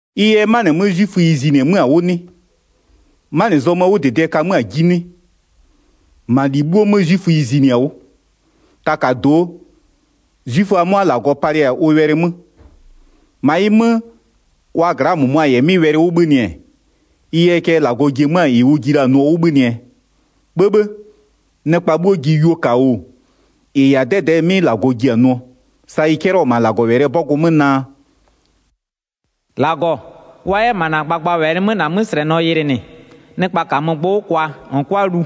Ɩ yɛ 'manɩ 'mö 'zwiföyi zinɩ-ɛ 'mö-a 'wʋ 'nɩ? 'Manɩ zɔmöö 'wʋdɩdɩɛ ka 'mö-a 'ji 'nɩ? 2-Ma -li 'bhuo 'mö 'zwiföyi zinɩ-a 'wʋ. Takado'o, 'zwiföa 'mʋa -Lagɔ palɩ-a ʋ wɛlɩ 'mö. 3-Ma ɩ 'mö, wa gla'aa -mʋmʋa -yɛ 'mɩ wɛlɩ 'wʋ 'bhönɩ-ɛ, ɩ yɛɛ cɛ -Lagɔ ji-e 'mö-a -ɩ ʋ ji la-a nʋɔ 'wʋ 'bhönɩɛ? 'Bhëbhë! Nɩkpa 'bhuo ji yuo -ka oo, -ɩ -yɛ-a 'dɛdɛɛ 'mɩ -Lagɔ ji-a nʋɔ, sa ɩ 'cɛlɩɔ-ɔ -ma -Lagɔwɛlɩɛ 'bɔgʋ 'mö naa: “-Lagɔ, wa 'yɛ -ma -na gbagbawɛlɩ 'mö -na 'möslɛnɔ yɩlɩnɩ, nɩkpa -kamö gbʋ 'wʋ kwa -n 'kʋa lu.”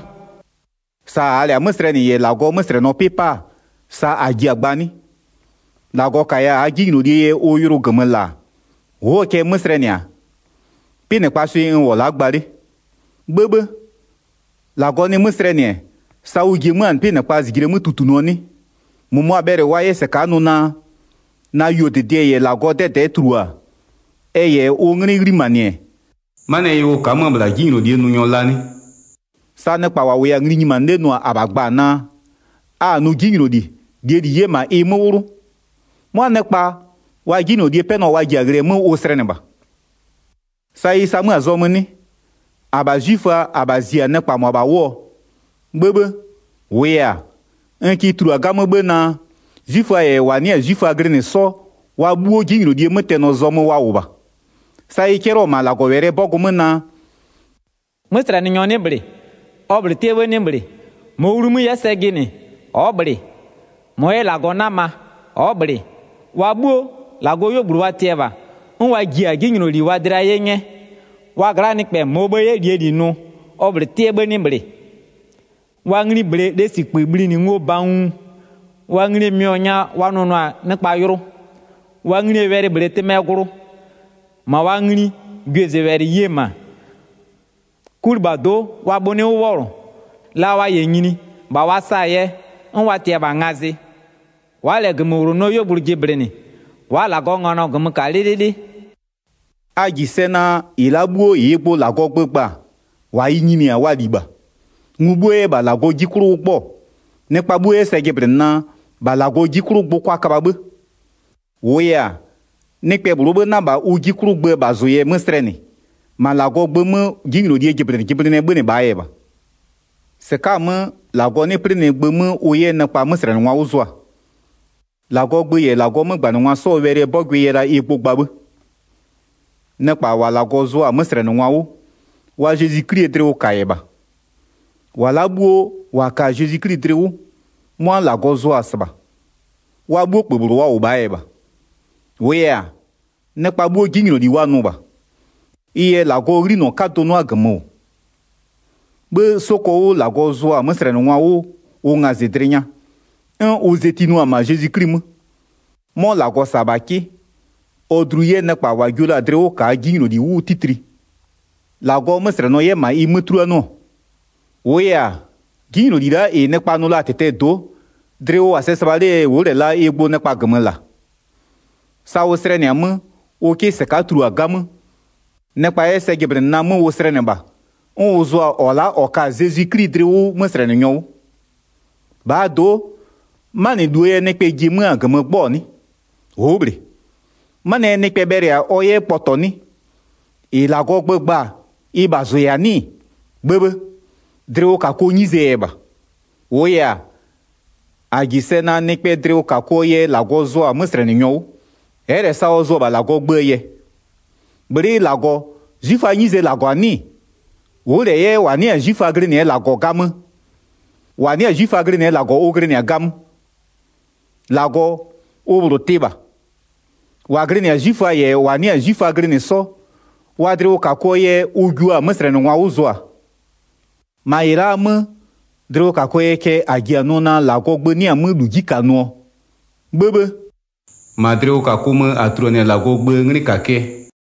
Sa -aa -lɛ-a 'mö slɛnɩ -yɛ -Lagɔɔ 'möslɛnɔ 'pɩ 'pa-a, sa -a ji-a gba 'nɩ? -Lagɔ -kaya -aa 'jinylolie yɛ ʋ yʋlʋ -gömö -la-a, ʋ'ʋɔ cɛ 'mö slɛnɩ-a? 'Pɩnɩkpaa swɩ n -wʋ-ɔ la'a gba 'le. 'Bhëbhë! -Lagɔ nɩ 'mö slɛnɩ-ɛ, sa ʋ ji-e 'mö-a 'pɩnɩkpa -zijle 'mö tutunʋɔ 'nɩ? 7-Mʋmʋa bhɛlɩ wa 'yɛ -sɩka'a nʋ naa: “Na yuodɩdɩɛ -yɛ -Lagɔɔ 'dɛdɛ'ɛ tulua-a, ɛ -yɛ ʋ 'nglɩ 'ghlimanɩ-ɛ, 'manɩɛ yɛ ʋ ka'a 'mö-ö -bhla 'jinylolie nʋnyɔ la 'nɩ?” Sa nɩkpa -wa -wʋya-a ngli nyimanɩ 'le nʋ-a -abha gba-a naa: “A-a nʋ 'jinyloli, -lie -li 'yɛ -ma ɩ 'mö 'wlʋ.” 'Mʋa nɩkpa, wa 'jinylolie 'pɛnɔ wa ji-a ghlɩɛ 'mö ʋ slɛnɩ -bha. Sa ɩ sa 'mö-a zɔmö 'nɩ? -Abha 'zwiföa, -abha zi-a nɩkpa -mʋabha 'wʋɔ? 'Bhëbhë! -Wʋʋ yɛ-a, n kɩ tulua 'gamö 'bhë naa, 'zwiföa -yɛ -wa 'nɩ-a 'zwiföa glɩnɩ 'sɔ, wa 'bhuo 'jinylolie 'mötɛnɔ zɔmö wa -wʋ -bha. Sa ɩ 'cɛlɩɔ-ɔ -ma -Lagɔwɛlɩɛ 'bɔgʋ 'mö naa: “'Möslɛnɩnyɔ 'nɩ -bhlɩ. Ɔ -bhlʋ 'tɩɛ 'bhë 'nɩ -bhlɩ. 11-Mɔɔ wlumö-ö 'yɛ sɛ jɩnɩ, ɔ'ɔ -bhlɩ. -Mɔ 'yɛ -Lagɔ 'nama, ɔ'ɔ -bhlɩ. Wa 'bhuo, -Lagɔɔ 'yuogblʋ wa tɩ-ɛ -bha, 'n wa ji-a 'jinyloli wa dlɩa 'ye 'nyɛ. Wa gla'aa nɩkpɛ -mɔɔ bhë-ë 'yɛ -lie -li nʋ, Ɔ -bhlʋ 'tɩɛ 'bhë 'nɩ -bhlɩ. Wa ngli -bhlee lesikpï bhlinɩ ngo banguu. Wa nglie mɩɔ nya wa nʋnʋ-a nɩkpa yʋlʋ. Wa nglie wɛlɩ -bhlee tɩmɛɛ glʋ. 14-Ma wa ngli gwiezʋwɛlɩ ye-e -ma. 'Kulɩbhado'o wa bhʋ 'nɩ 'wʋ 'wɔlʋ. La wa -yɛ nyini, -bha wa sa-a yɛ, 'n wa tɩ-ɛ -bha ngazɩ. Wa'a -lɛ -gömöwlonɔɔ 'yuogblʋ jɩblɩnɩ, wa'a -Lagɔɔ nganɔ -gömö -ka 'lɩlɩlɩ.” A -ji sɛ naa, -ɩ la'a 'bhuo -ɩɩ gbʋ -Lagɔɔ gbö gba-a, -wa ɩ nyini-a, wa -li -bha, ngu 'bhuo 'yɛ -bha -Lagɔɔ 'ji 'klʋ 'wʋ 'gbɔ-ɔ, nɩkpa 'bhuo 'yɛ sɛ jɩblɩnɩ naa, -bha -Lagɔ 'ji 'klʋ gbʋ kʋa köbha 'bhë. 20-Wʋʋ yɛ-a, nɩkpɛ -bhlʋɔ 'bhë 'na -bha ʋ 'ji 'klʋ gböö -bhazʋ yɛ 'mö slɛnɩ, -ma -Lagɔɔ gbö 'mö 'jinylolie jɩblɩnɩjɩblɩnɩɛ 'bhönɩ -bhaa yɛ -bha. Sa -Lagɔ slɛmanɩ-a -ma Zezwi 'Kli 'mö nɩkpa 'mö 21-Sɩka'a-a 'mö, -Lagɔ 'nɩ 'plɩnɩ gbö 'mö ʋ 'yɛ nɩkpa 'möslɛnɩngwa 'wʋ zʋa, -Lagɔɔ gbö -yɛ -Lagɔɔ 'mögbanɩngwa 'sɔɔ wɛlɩɛ 'bɔgʋɩ yɛ la ɩ gbʋ gba 'bhë. Nɩkpa -wa -Lagɔ zʋa-a 'möslɛnɩngwa 'wʋ, wa Zezwi 'Klie dlɩwʋka -yɛ -bha. -Wa la'a 'bhuo -wa ka-a Zezwi 'Kli dlɩ 'wʋ, 'mʋa -Lagɔ zʋa-a -sɩbha. Wa 'bhuo -kpö -bhlʋ wa -wʋ -bhaa yɛ -bha. 23-Wʋʋ yɛ-a, nɩkpa 'bhuo 'jinyloli wa nʋ -bha. Ɩ yɛ -Lagɔɔ 'ghlinɔ 'kadʋ 'nʋa -gömö -wʋ. 'Bhë 'soko 'wʋ -Lagɔ zʋa-a 'möslɛnɩngwa 'wʋ ʋ ngazɩdlɩ nya, 'n ʋ zetinʋa-a -ma Zezwi 'Kli 'mö. 'Mɔ -Lagɔ -sa-a -bha 'kɩ, ɔ dlu 'yɛ nɩkpa -wa jio la-a dlɩ 'wʋ -kaa 'jinyloli 'wʋ 'titli, -Lagɔɔ 'möslɛnɔ 'yɛ -ma ɩ 'mö 'tuluanɩɔ. -Wʋʋ yɛ-a, 'jinyloli la'a -ɩ nɩkpa nʋ la-a -tɩtɛɛ do'o, dlɩ ʋ -wʋ-a sɛ -sɩbha 'lee yɛ ʋ'ʋ -lɛ la ɩ gbʋ nɩkpa -gömö -la. Sa ʋ slɛnɩ-a 'mö, ʋ 'kɩ -sɩka'a tulua 'gamö, nɩkpa 'yɛ sɛ jɩblɩnɩ naa 'mö ʋ slɛnɩ -bha, 'n ʋ zʋa-a -ɔ la'a -ɔ ka-a Zezwi 'kli dlɩ 'wʋ 'möslɛnɩnyɔ 'wʋ. 27-Bhaa do'o, 'manɩluo yɛ nɩkpɛ ji-e 'mö-a -gömö gbɔ-ɔ 'nɩ? Ʋ'ʋ -bhlɩ. 'Manɩɛ yɛ nɩkpɛ bhɛlɩ-a ɔ 'yɛ kpɔtɔ 'nɩ? -Ɩ -Lagɔɔ gbö gba-a ɩ -bhazʋ -yɛ-a 'nɩ-ɩ? 'Bhëbhë! Dlɩwʋkakʋɔ 'nyizee yɛ -bha. 28-Wʋʋ yɛ-a, -a -ji sɛ naa nɩkpɛɛ dlɩwʋkakʋɔ yɛ -Lagɔ zʋɔ-a 'möslɛnɩnyɔ 'wʋ, ɛ'ɛ -lɛ sa ɔ zʋ-ɔ -bha -Lagɔɔ gböö yɛ. Bhlɩ'ɩ -Lagɔ, 'zwiföaa 'nyizee -Lagɔ-a 'nɩ-ɩ? Ʋ'ʋ -lɛ 'yɛ -wa 'nɩ-a 'zwiföa glɩnɩɛ -Lagɔ 'gamö? -Wa 'nɩ-a 'zwiföa glɩnɩɛ -Lagɔ ʋ glɩnɩ-a 'gamö. 30-Lagɔ, ʋ -bhlʋ tɩ -bha. -Wa glɩnɩ-a 'zwiföa -yɛ -wa 'nɩ-a 'zwiföa glɩnɩ 'sɔ, wa dlɩwʋkakʋɔ yɛ ʋ jua-a 'möslɛnɩngwa 'wʋ zʋaa. 31-Ma -ɩ la'aa 'mö, dlɩwʋkakʋɔ yɛɛ cɛ -a ji-a nʋ naa -Lagɔɔ gbö 'nɩ-a 'mö -lu 'ji -ka-a nʋɔ? 'Bhëbhë! -Ma dlɩwʋkakʋ mö -a tuluanɩ-a -Lagɔɔ gböö 'nglɩkakɩɛ.